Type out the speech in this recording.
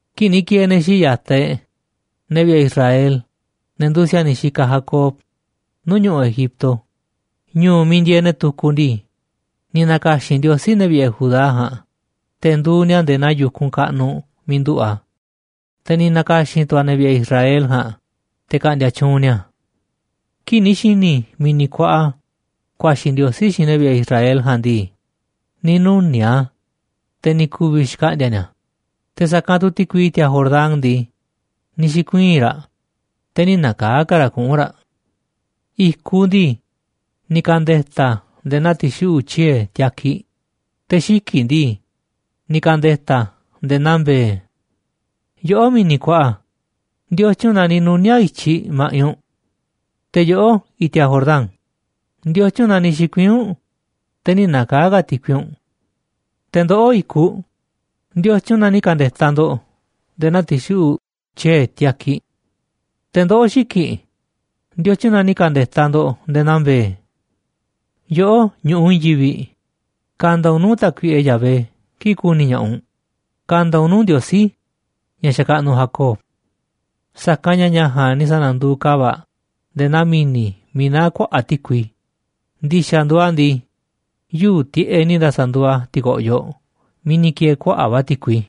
Kii̱ꞌ ni̱ ki̱e̱e̱ ne̱ xii̱ꞌ ya̱taꞌ e̱ꞌ, ne̱ vi̱ꞌe̱ Israel, ne̱ nduuꞌ si̱a̱niꞌ xikaꞌ Jacob, nuu̱ꞌ ñu̱ꞌuꞌ Egipto, ñu̱u̱ miiꞌ ndieeꞌ ne̱ tukuꞌ ndii, ni̱ na̱ka̱xi̱n Ndiosí ne̱ vi̱ꞌe̱ Judá ja̱a̱nꞌ, te̱ nduuꞌ ni̱a̱ nde̱e̱ naa yu̱kunꞌ kaꞌnuꞌ miiꞌ nduꞌu̱ꞌ a̱, te̱ ni̱ na̱ka̱xi̱n tu̱ a̱ ne̱ vi̱ꞌe̱ Israel ja̱a̱nꞌ, te̱ ka̱ꞌndi̱a̱ tyuunꞌ ni̱a̱. Kii̱ꞌ ni̱ xi̱ni̱ mi̱ni̱ kuaꞌa ku̱a̱xi̱ Ndiosí xiinꞌ ne̱ vi̱ꞌe̱ Israel ja̱a̱nꞌ ndii, ni̱ nuni̱a̱ꞌ a̱, te̱ ni̱ ku̱vi̱ xkaꞌndi̱a̱ ni̱a̱, te̱ sa̱kanꞌ tu̱ ti̱kui i̱ti̱a̱ Jordán ndii, ni̱ xi̱kuii̱n raꞌ, te̱ nï̱ na̱kaa̱ ka̱ raꞌ kuꞌu̱n raꞌ. I̱kuꞌ ndii, ni̱ ka̱nde̱ta̱ a̱ nde̱e̱ naa ti̱xuꞌu̱ꞌ tyiee̱ tiakiꞌ, te̱ xiki̱ꞌ ndii, ni̱ ka̱nde̱ta̱ a̱ nde̱e̱ naa mbe̱e̱. Yoꞌó, mi̱ni̱ kuaꞌa, ¿ndiotyun na ni̱ nuni̱a̱ꞌ i̱tyiꞌ ma̱ꞌiꞌ u̱nꞌ? Te̱ yoꞌó, i̱ti̱a̱ Jordán, ¿ndiotyun na ni̱ xi̱kuii̱n u̱nꞌ, te̱ nï̱ na̱kaa̱ ka̱ ti̱kui u̱nꞌ? Te̱ ndoꞌó, i̱kuꞌ, ¿ndiotyun na ni̱ ka̱nde̱ta̱ ndo̱ꞌ nde̱e̱ naa ti̱xuꞌu̱ꞌ tyiee̱ tiakiꞌ? te̱ ndoꞌó, xiki̱ꞌ, ¿ndiotyun na ni̱ ka̱nde̱ta̱ ndo̱ꞌ nde̱e̱ naa mbe̱e̱? Yoꞌó, ñu̱ꞌuꞌ i̱i̱n yivi̱ꞌ, ka̱nda̱ u̱nꞌ nuu̱ꞌ Tákuiꞌe Yahvé kii̱ꞌ ku̱ni̱ ña̱ꞌaꞌ u̱nꞌ, ka̱nda̱ u̱nꞌ nuu̱ꞌ Ndiosí ña̱ xakaꞌnuꞌ Jacob. Sa̱kanꞌ ña̱ ña̱ ja̱a̱nꞌ ni̱ sa̱na̱nduuꞌ ka̱va̱ꞌ nde̱e̱ naa mi̱ni̱ miiꞌ naá kuaꞌa̱ꞌ ti̱kui, ndi̱xa̱ nduuꞌ a̱ ndii, yuu̱ꞌ tiꞌeꞌ ni̱ sa̱na̱nduuꞌ a̱ ti̱ko̱ꞌyoꞌ miiꞌ ni̱ ki̱e̱e̱ kuaꞌa̱ꞌ va̱ ti̱kui.